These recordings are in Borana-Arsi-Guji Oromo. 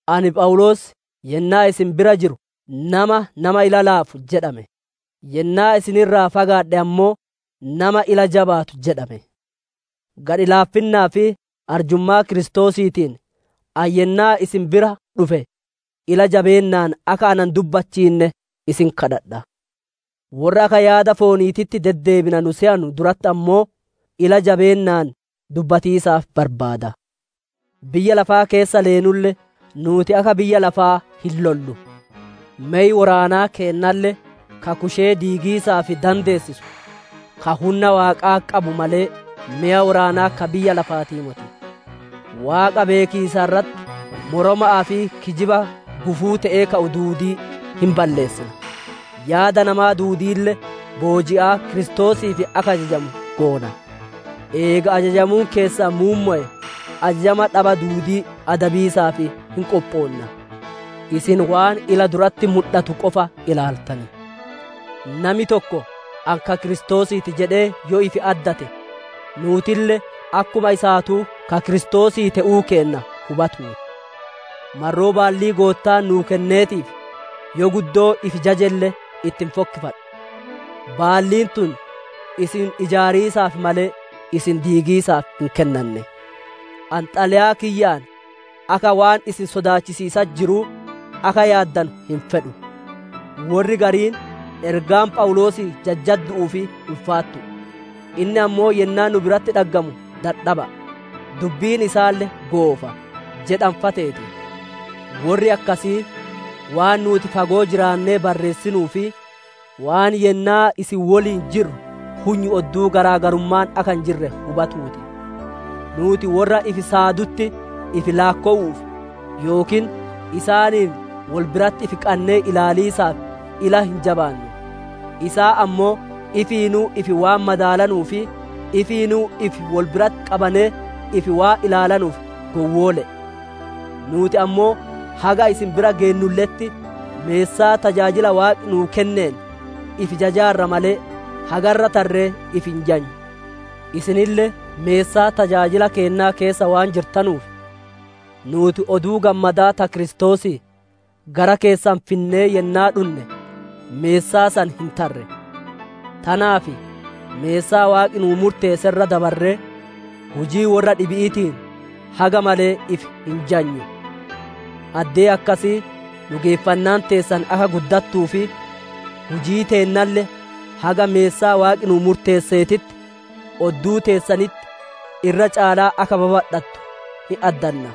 Ani Phawuloos yennaa isin bira jiru nama, «Nama ila laafu» jedhame; yennaa isin irraa fagaadhe ammoo, «Nama ila jabaatu» jedhame; gadhi laaffinnaa fi arjummaa Kiristoosiitiin, ani yennaa isin bira dhufe ila jabeennaan akka na hin dubbachiinne isin kadhadha; worra akka yaada fooniititti deddeebina nu seyanu duratti ammoo, ila jabeennaan dubbatiisaaf barbaada. Biyya lafaa keessa leenulle, nuuti akka biyya lafaa hin lollu. Mey woraanaa keennalle ka kushee diigiisaaf dandeessisu, ka hunna Waaqaa qabu malee, meya woraanaa ka biyya lafaatii moti. Waaqa beekiisa irratti moroma'aa fi kijiba gufuu te'ee ka'u duudii hin balleessina; yaada namaa duudiille booji'aa Kiristoosiif akka ajajamu goona. Eega ajajamuun keessan muummowe, ajajama dhaba duudii adabiisaaf hin qophoonna. Isin waan ila duratti mudhatu qofa ilaaltan. Nami tokko ani ka Kiristoosii ti jedhee yoo ifi addate, nuutille akkuma isaatuu ka Kiristoosii te'uu kenna hubatuu ti. Marroo baallii Goottaan nuu kenneetiif, yoo guddoo ifi jajelle itti hin fokkiffadhu; baalliin tun isin ijaariisaaf malee, isin diigiisaaf hin kennanne. Ani xalayaa kiyyaan akka waan isin sodaachisiisatti jiruu akka yaaddanu hin fedhu. Worri gariin, «Ergaan Phawuloosii jajjaddu'uu fi ulfaattu'u; inni ammoo yennaa nu biratti dhaggamu dadhaba'a; dubbiin isaalle goofa» jedhan fa'a teeti. Worri akkasii waan nuuti fagoo jiraannee barreessinuu fi waan yennaa isin woliin jirru hunyu odduu garaa garummaan akka hin jirre hubatuu ti. Nuuti worra ifi saadutti ifi laakkowu'uuf yookiin isaaniin wol biratti ifi qannee ilaaliisaaf ila hin jabaannu. Isaan ammoo ifiinuu ifi waan madaalanuu fi ifiinuu ifi wol biratti qabanee ifi waan ilaalanuuf gowwoole'e. Nuuti ammoo haga isin bira geennulle'etti, meessaa tajaajila Waaqi nuu kenneen ifi jajaarra malee, haga irra tarree ifi hin jajnu. Isinille meessaa tajaajila keennaa keessa waan jirtanuuf, nuuti Oduu Gammadaa ta Kiristoosii gara keessan finnee yennaa dhunne meessaa san hin tarre. Tanaaf meessaa Waaqi nuu murteesse irra dabarree, hujii worra dhibi'iitiin haga malee ifi hin jajnu; addee akkasii dhugeeffannaan teessan akka guddattuu fi hujii teennalle haga meessaa Waaqi nuu murteesseetitti, odduu teessanitti irra caalaa akka babadhatu hin addanna.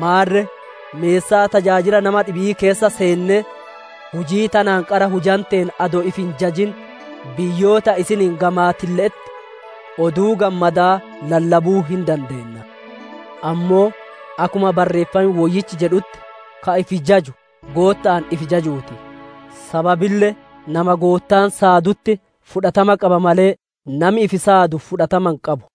Maarre meessaa tajaajila nama dhibi'ii keessa seennee, hujii tanaan qara hujanteen adoo ifi hin jajin, biyyoota isiniin gamaatille'etti Oduu Gammadaa lallabuu hin dandeenna. Ammoo akkuma Barreeffam Woyyichi jedhutti, «Ka ifi jajuu Gootta'aan ifi jajuu ti». Sababille nama Goottaan saadutti fudhatama qaba malee, nami ifi saadu fudhatama hin qabu.